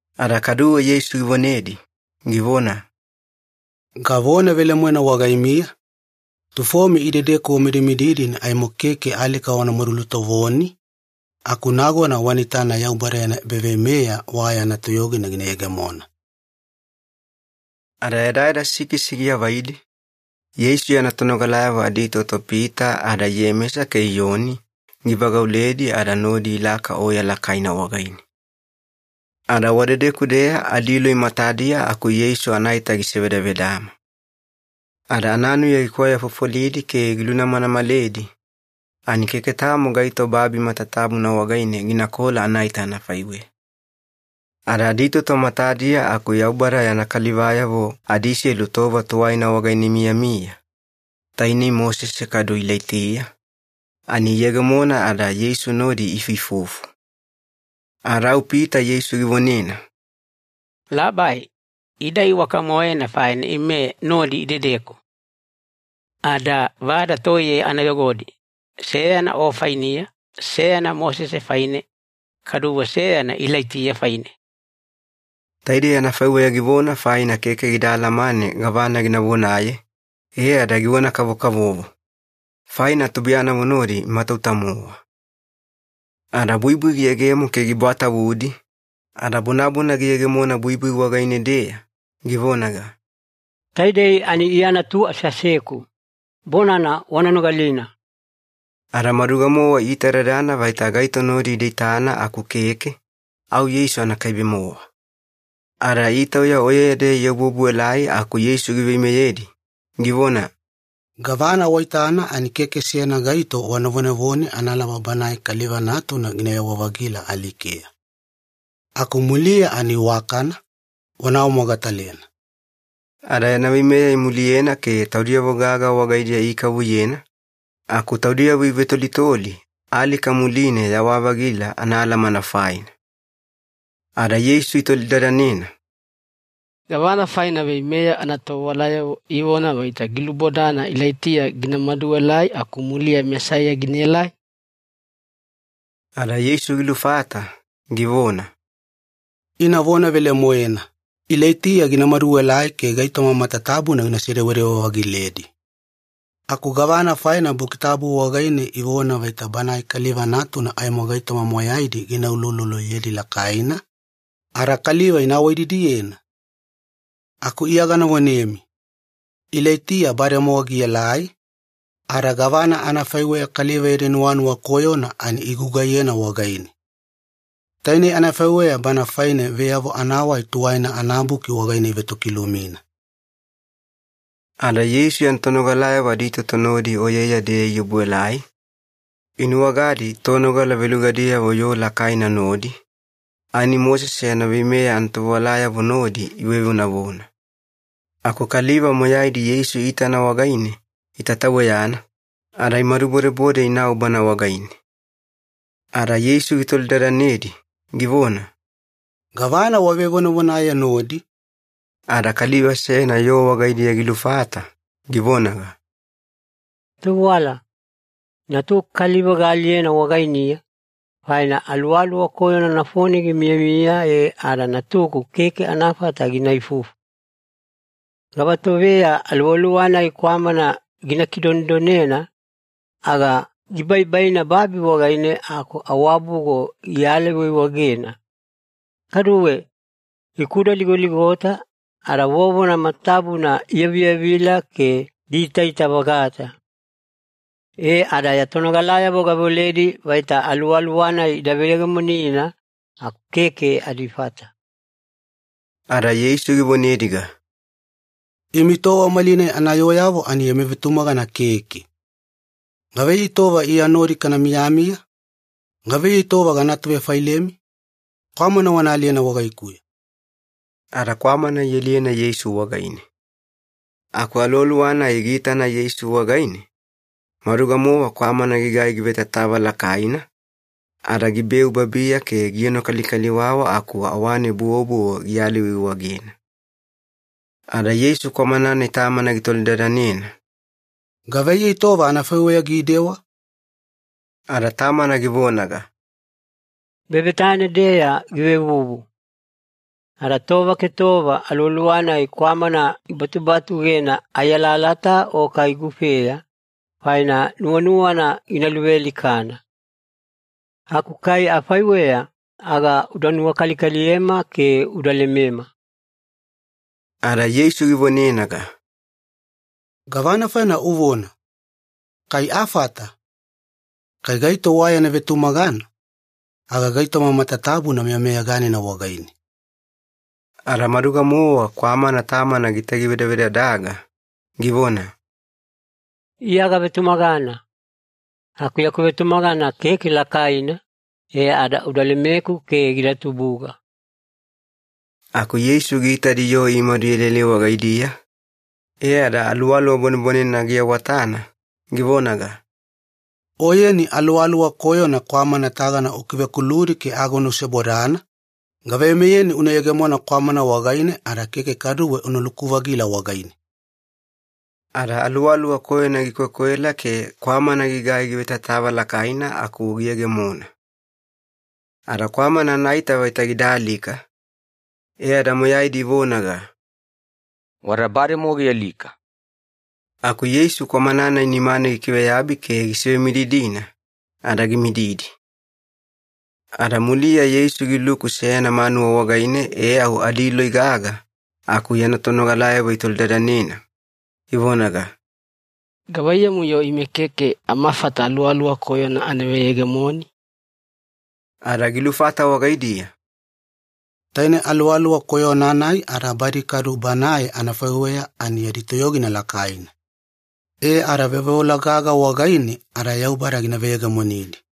Ada kaduwe Yeisu givonedi, givona, “Gavona velemoena wagaimiya, tufomi idedeku wamidimididi ani aimo keke alika wanamadu lutovoni, aku nagona wana itana Yaubada yana ebaveimeya wa yana toyogina gina yegemona.” Ada yadayada sikisi giavaidi, Yeisu yana tonogalayavo aditoto Pita ada Iyemesa ke Iyoni givagauledi ada nodi ilaka oya lakaina wagaine. Ada wadedeku-deya adiloi matadiya aku Yeisu anaita gisevedavedama. Ada ananuya gikwayafofolidi ke gilunamanamaledi, ani keke tamo gaito babi matatabuna wagaine ginakola anaita anafaiweya. Ada aditoto matadiya aku Yaubada yana kalivayavo adiselu tova tuwaina wagaine imiyamiya, tainei Mosese kadu Ilaitiya, ani iyegemona ada Yeisu nodi iifuifufu. Ada au Pita Yeisu givonena, “Labai, ida iwaka-moena faina ime nodi idedeku. Ada vada toiye ana yogodi, seyana O fainiya, seyana Mosese faine, kaduwe seyana Ilaitiya faine.” Taidei anafaiweya givona faina keke gida alamane gavana gina vonaye, e ada givona-kavokavovo. Faina tubuiyanavo nodi imatauta-mowa. Ada buibui giyegemo ke gibwatavudi, ada bonabona giyegemona buibui wagaine-deya, givonaga, “Taidei ani Iya Natu aseaseku. Bonana wana nogalina.” Ada maduga-mowa iitadadana vaita gaito nodi ida itana aku keke, au Yeisu anakaibe-mowa. Ada itauya oyeya-deya iobuobuelai aku Yeisu giveimeyedi, givona, “Gavana waitana ani keke seyana gaito wana vonevone analaba Banae Kaliva Natuna ginayawa-vagila alikeya. Aku muliya ani iwakana, wana awamogatalena.” Ada yana veimeya imuliyena ke taudiyavo gaga wagaidiya ikavuyena, aku taudiyavo ivetolitoli ‘alika muline yawa-vagila’ anaalamana faina. Ada Yeisu itolidadanena, “Gavana faina veimeya anatovewalayavo ivona vaita gilubodana Ilaitiya gina maduelai aku muliya Mesaiya ginaelai?” Ada Yeisu gilufata, givona, “Ina vona velemoena, Ilaitiya gina maduelai ke gaitoma matatabuna gina sedewedewe-vagiledi. Aku gavana faina Buki Tabu wagaine ivona vaita Banae Kaliva Natuna aimo gaitoma moyaidi gina ulouloloyedi lakaina, ada kaliva ina awaididiyena? Aku Iya gana vonemi, Ilaitiya bademowa gielai, ada gavana anafaiweya kaliva yadi nuwanuwa koyona ani igugaiyena wagaine. Tainei anafaiweya Bana faine Veyavo Anawai Tuwaina anaBuki wagaine ivetokilumina.” Ada Yeisu yana tonogalayavo aditoto nodi oyeya-deya iobuelai, inuwagadi tonogala velugadiyavo yoo lakaina nodi, ani Mosese yana veimeya anatovewalayavo nodi ivevonavona. Aku kaliva moyaidi Yeisu iitana wagaine itataweyana, ada imadubodebode inau Bana wagaine. Ada Yeisu gitolidadanedi, givona, “Gavana wavevonavonaye nodi?” Ada kaliva seyana yoo wagaidiya gilufata, givonaga, “Tovewala, natuku kaliva gaaliyena wagainiya, faina aluwaluwa koyona nafone gimiyamiya e ada natuku keke anafata gina ifufu. Gavatoveya aluwaluwa-nai kwamana gina kidonedonena, aga gibaibaina babi wagaine aku awabugo gialaiwaiwagena. Kaduwe, gikudaligoligota, ada vovona matatabuna iyaviyavivila ke giitaita-vagata. E ada ya tonogalayavo gaveoledi vaita aluwaluwa-nai ida veyegemonina, aku keke adifata.” Ada Yeisu givonediga, “Imi tova malinai anayooyavo ani yami vetumagana keke. Gavaiyei tova Iya nodi kana miyamiya? Gavaiyei tova gana atuvefailemi? Kwamana wana aliyena wagaikuya.” Ada kwamana ialiyena Yeisu wagaine. Aku aluwaluwa-nai giitana Yeisu wagaine, maduga-mowa kwamana gigai givetatava lakaina, ada gibeu babiya ke gienokalikaliwawa aku awane buwobuwo giyalaiwaiwaigena. Ada Yeisu kwamana-nai tamana gitolidadanena, “Gavaiyei tova anafaiweya gidewa?” Ada tamana givonaga, “Bebetane-deya givevuvu. Ada tova ke tova aluwaluwa-nai kwamana gibatubatugena ai alalata o kai gufeya, faina nuwanuwana gina luvealikana. Aku kai afaiweya aga uda nuwakalikaliyema ke uda lemema.” Ada Yeisu givonenaga, “Gavana faina uvona ‘Kai afata?’ Kai gaito wa yana vetumagana, aga gaitoma matatabuna meyameyaganina wagaine.” Ada maduga-mowa kwamana tamana gitagivedavedadaga, givona, “Iya gavetumagana. Aku yaku vetumagana keke lakaina, e ada uda lemeku ke gida tubuga.” Aku Yeisu giitadi yoo imadu ielaelai wagaidiya, e ada aluwaluwa bwanebwanenena giawatana, givonaga, “Oyeni aluwaluwa koyona kwamana tagana ukivekuludi ke agona usebodana, gaveimeyeni una yegemona kwamana wagaine ada keke kaduwe unaluku-vagila wagaine.” Ada aluwaluwa koyona gikwekwela ke kwamana gigai givetatava lakaina aku giyegemona. Ada kwamana anaita vaita gida alika, e ada moyaidi ivonaga, “Wada bademowa gialika.” Aku Yeisu kwamana-nai nimane gikiveyabi ke gisivemididina, ada gimididi. Ada muliya Yeisu giluku seyana manuwa wagaine e au adiloi gaga, aku yana tonogalayavo itolidadanena, ivonaga, “Gavaiyamu-yo ime keke amafata aluwaluwa koyona ana veyegemoni?” Ada gilufata wagaidiya, “Taine aluwaluwa koyona-nai ada badi kadu banae anafaiweya ani yadi toyogina lakaina, e ada veoveola gaga wagaine ada Yaubada gina veyegemonidi.”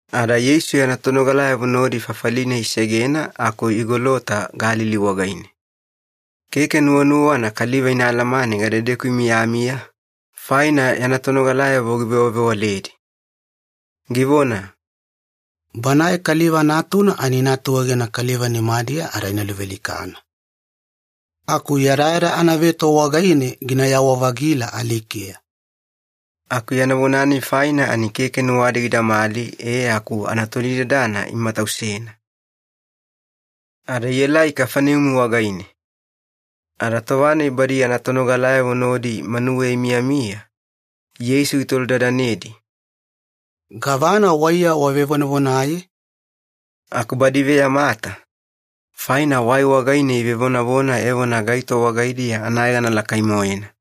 Ada Yeisu yana tonogalayavo nodi fafali-nai isegena aku igolota Galili wagaine. Keke nuwanuwana kaliva ina alamane gadedeku imiyamiya, faina yana tonogalayavo givewavewaledi. Givona, “Banae Kaliva Natuna ani ina atuegena kaliva nimadiya ada ina luvealikana. Aku yadayada anaveto wagaine ginayawa-vagila alikeya.” Aku yana vona-nai faina ani keke nuwadi gidamali e aku anatolidadana imatausena. Ada ielai Kafaneumi wagaine. Ada tova-nai badi yana tonogalayavo nodi manuweya imiyamiya, Yeisu gitolidadanedi, “Gavana waiya wavevonavonaye?” Aku badi iveyamata, faina wai wagaine ivevonavona evona gaito wagaidiya anayegana lakai-moena.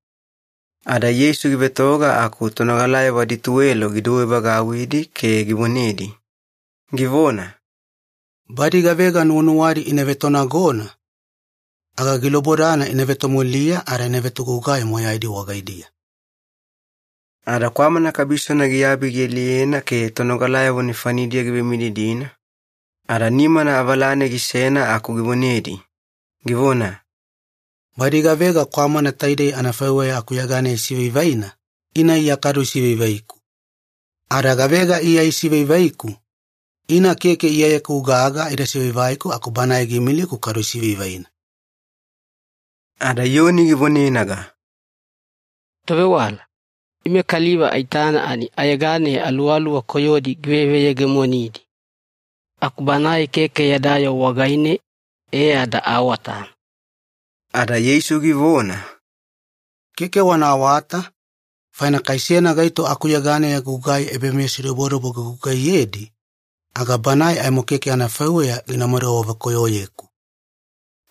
Ada Yeisu givetoga aku tonogalayavo adituwelo gidouwevagauwidi ke givonedi, givona, “Badi gavega nuwanuwadi ina vetonagona, aga gilubodana ina vetomuliya ada ina vetogugai moyaidi wagaidiya.” Ada kwamana kabisona giabi gialiyena ke tonogalayavo nefanidiya givemididina, ada nimana avalane gisena aku givonedi, givona, “Badi gavega kwamana taidei anafaiweya akuyeganeya isivaivaina, ina Iya kadu isivaivaiku. Ada gavega Iya isivaivaiku, ina keke Iyayeku gaga ida sivaivaiku aku Banae giimiliku kadu isivaivaina.” Ada Iyoni givonenaga, “Tovewala, ime kaliva aitana ani ayeganeya aluwaluwa koyodi giveveyegemonidi. Aku banae keke yada yoo wagaine, e ada aawatana.” Ada Yeisu givona, “Keke wana awata, faina kai seyana gaito akuyeganeya gugai ebameyasidobodobo gigugaiyedi, aga banae aimo keke anafaiweya ginamadu awavekoyoyeku.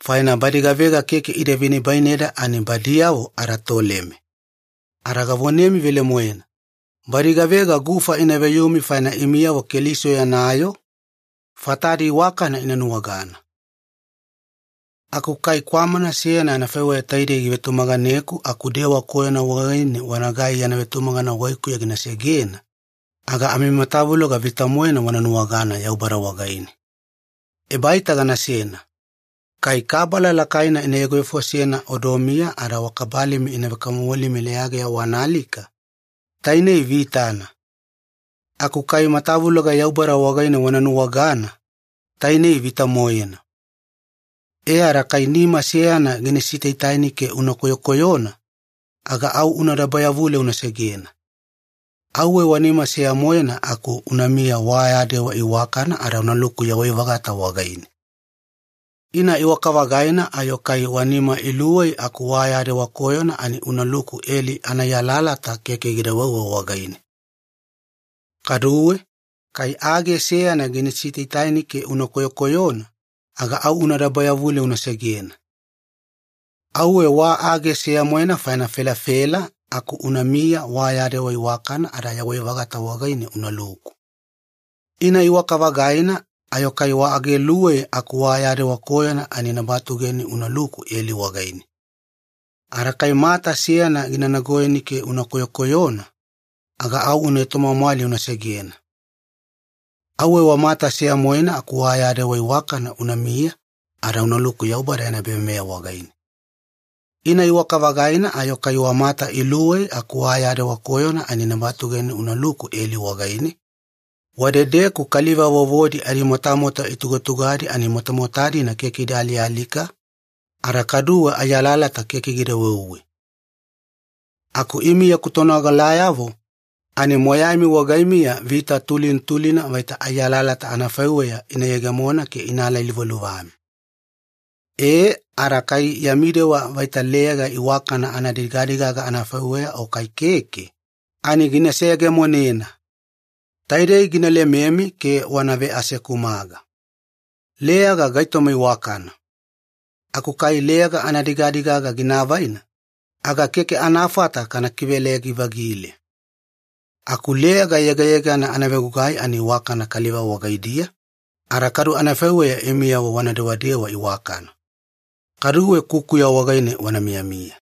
Faina badi gavega keke ida venibaineda ani badiyavo adatoleme. Ada gavonemi velemoena, badi gavega gufa ina veyumi faina imiyavo Keliso yana yoo, fatadi iwakana ina nuwagana. “Aku kai kwamana seyana anafaiweya taidei givetumaganeku aku dewa koyona wagaine wanagai yana vetumagana wagaikuya gina segena, aga amimatavuloga vita-moena wana nuwagana Yaubada wagaine. Ebaita ganasena. Kai kabala lakaina ina yogovefosena odomiya ada wa kabalimi ina vekamomolimi leyageya wana alika, tainei vitana. Aku kai matavuloga Yaubada wagaine wana nuwagana, tainei vita-moena. E ada kai nima seyana gina sitaitaini ke una koyokoyona, aga au una dabayavule una segena. Auwe wa nima seya-moena aku unamiya wa ya dewa iwakana ada unaluku yawai-vagata wagaine. Ina iwaka-vagaina ayo kai wa nima iluwei aku wa ya dewa koyona ani unaluku eli anaai alalata keke gida weuwe wagaine. Kaduwe, kai age seyana gina sitaitaini ke una koyokoyona, aga au una dabayavule una segena. Auwe wa age seya-moena faina felafela aku unamiya wa ya dewa iwakana ada yawai-vagata wagaine unaluku. Ina iwaka-vagaina ayo kai wa age iluwei aku wa ya dewa koyona ani ina batugeni unaluku eli wagaine. Ada kai mata seyana gina nagoyeni ke una koyokoyona, aga au una etomwamwali una segena. Auwe wa mata seya-moena aku wa ya dewa iwakana unamiya ada unaluku Yaubada yana ebaveimeya wagaine. Ina iwaka-vagaina ayo kai wa mata iluwei aku wa ya dewa koyona ani ina batugeni unaluku eli wagaine, wadedeku ‘kaliva vovodi adimotamota itugatugadi ani motamota-dina keke ida alialika, ada kaduwe ai alalata keke gida weuwe.’ Aku imi yaku tonogalayavo ani moyaimi wagaimiya vita tulina tulina vaita ai alalata anafaiweya ina yegemona ke ina alailuvaluvami. E ada kai yami dewa vaita leyaga iwakana anadigadigaga anafaiweya o kai keke, ani gina seyegemonena. Taidei gina lememi ke wana veasekumaga. Leyaga gaitoma iwakana, aku kai leyaga anadigadigaga gina avaina, aga keke anafata kana kiveleyagi-vagile. Aku leyaga yegayegana anavegugai ani iwakana kaliva wagaidiya, ada kadu anafaiweya imiyavo wana dewadewa iwakana. Kaduwe kukuya wagaine wana miyamiya.”